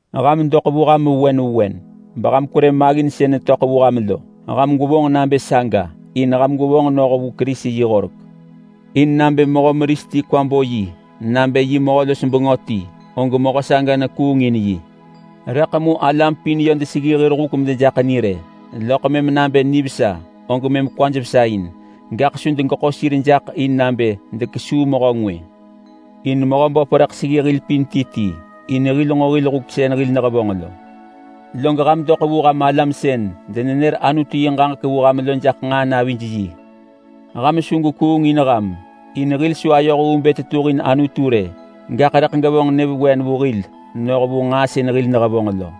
Ham doḳ vu ham vewen vewen beham kwerë maggin sën netöḳ vu ham lo. Ham gwevonġ nabë saga in ham gwevonġ noh vu Kerisi yi horek. In nabë mehö meris ti kwa bo yi nabë yiḳ mehö-los-bengö ti, og mehö saga nekuung in yi. Rëḳ mu alam pin yö deseggi hir huk medejaḳ ni rë, loḳ mëm nabë nivesa og mëm kwaj vesa in, gaḳ su degeḳo sir jaḳ in nabë dekesuu mehö ngwë. In Mehöböp rëḳ seggi hil pin ti ti in hil nġo hil huk sën hil nehevonġ lo. Log ham doḳ vu ham alam sën denenër Anutu yi ġaġek vu ham lo jaḳ nġaa navij yi. Ham su gwekuung in ham! In hil su ayoh vu bë tetuhin Anutu rë, gaḳ rëḳ gevonġ nyëvewen vu hil noh vu nġaa sën hil nehevonġ lo.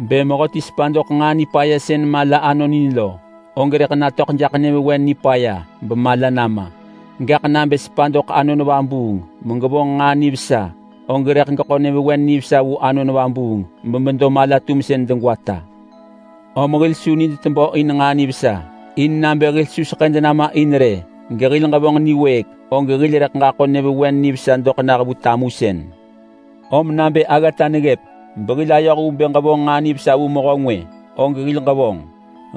Bë mehöti sepa doḳ nġaa nipaya sën mala anonin lo, og rëḳ natöḳ jaḳ nyëvewen nipaya bemala nama. Gaḳ nabë sepa doḳ Anon Vabuung megevonġ nġaa nivesa, og rëḳ geḳo nyëvewen nivesa vu Anon Vabuung bemedo mala-tumsën degwata. Om hil su nid tebö in nġaa nivesa. In nabë hil su seḳëd nama in rë gehil ġevonġ niwëëk, og hil rëḳ ġaḳo nyëvewen nivesa doḳ nah vu tamusën. Om nabë aggata neggëp behil ayoh vu bë ġevonġ nġaa nivesa vu mehö ngwë, og hil ġevonġ.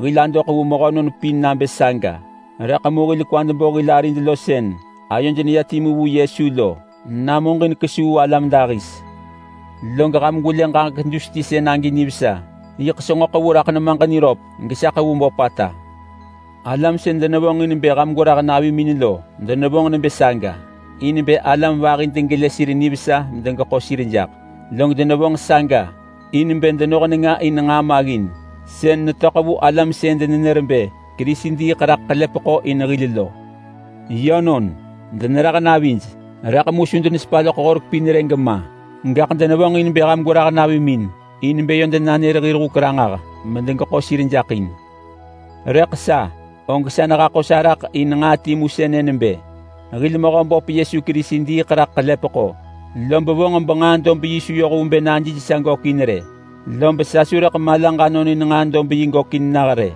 Hil adoḳ vu mehönon pin nabë saga, rëḳ mu hil kwad bo hil arid lo sën ayoj neya timu vu Yesu lo namuġin kesuu alam dahis. Log ham gwelë ġaġek dus ti sën agi nivesa! Yiḳ senġo ḳevu raḳ nemaġ niröp gesa ḳevu böpata! Alam sën denevonġin bë ham gwerah navimin lo denevonġ nebë saga in bë alam vahi degelë sir nivesa medegeḳo sir jaḳ. Log denevonġ saga in bë denoh nenga in nġaa maggin sën netöḳ vu alam sën denenër bë Kerisi diiḳ raḳ ḳelepeḳo in hil lo. Yönon, denerah navij, rëḳ mu su denesepa loḳ Horek pin rë gema. Gaḳ denevonġin bë ham gwerah navimin in bë yö denanër hir huk ranġah medegeḳo sir jaḳ in. Rëḳ sa, og sa nehaḳo sa raḳ in nġaa timu sënë nebë: Hil Mehöböp Yesu Kerisi diiḳ raḳ ḳelepeḳo, lob vonġ benġaa dob yi su yoh vu bë najij sa gökin rë. Lob sa su rëḳ malaġ anonin nġaa dob yi gökin nah rë.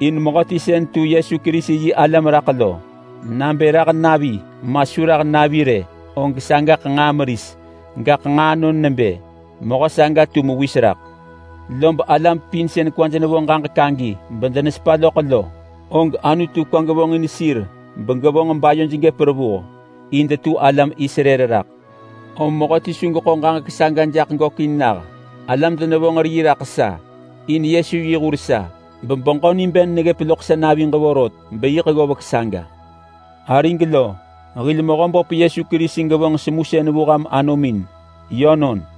In mehöti sën tu Yesu Kerisi yi alam raḳ lo, nabë rah navi ma su rah navi rë, og sagaḳ nġaa meris, gaḳ nġaa anon nebë mehö saga tu mewis raḳ. Lob alam pin sën kwaj nevo ġaġek agi bedenesepa loḳ lo, og Anutu kwa gevonġin sir begevonġ bayoj gëp revuh, in detu alam Israel raḳ. Om mehöti su geḳo ġaġek saga jaḳ gökin nah. Alam denevonġ rii raḳ sa in Yesu yi hur sa, bebeġö niben neggëp loḳ sa naviġ vorot beyiḳ ggovek saga. Arig lo, hil Mehöböp Yesu Kerisi gevonġ semusën vu ham anomin. Yönon.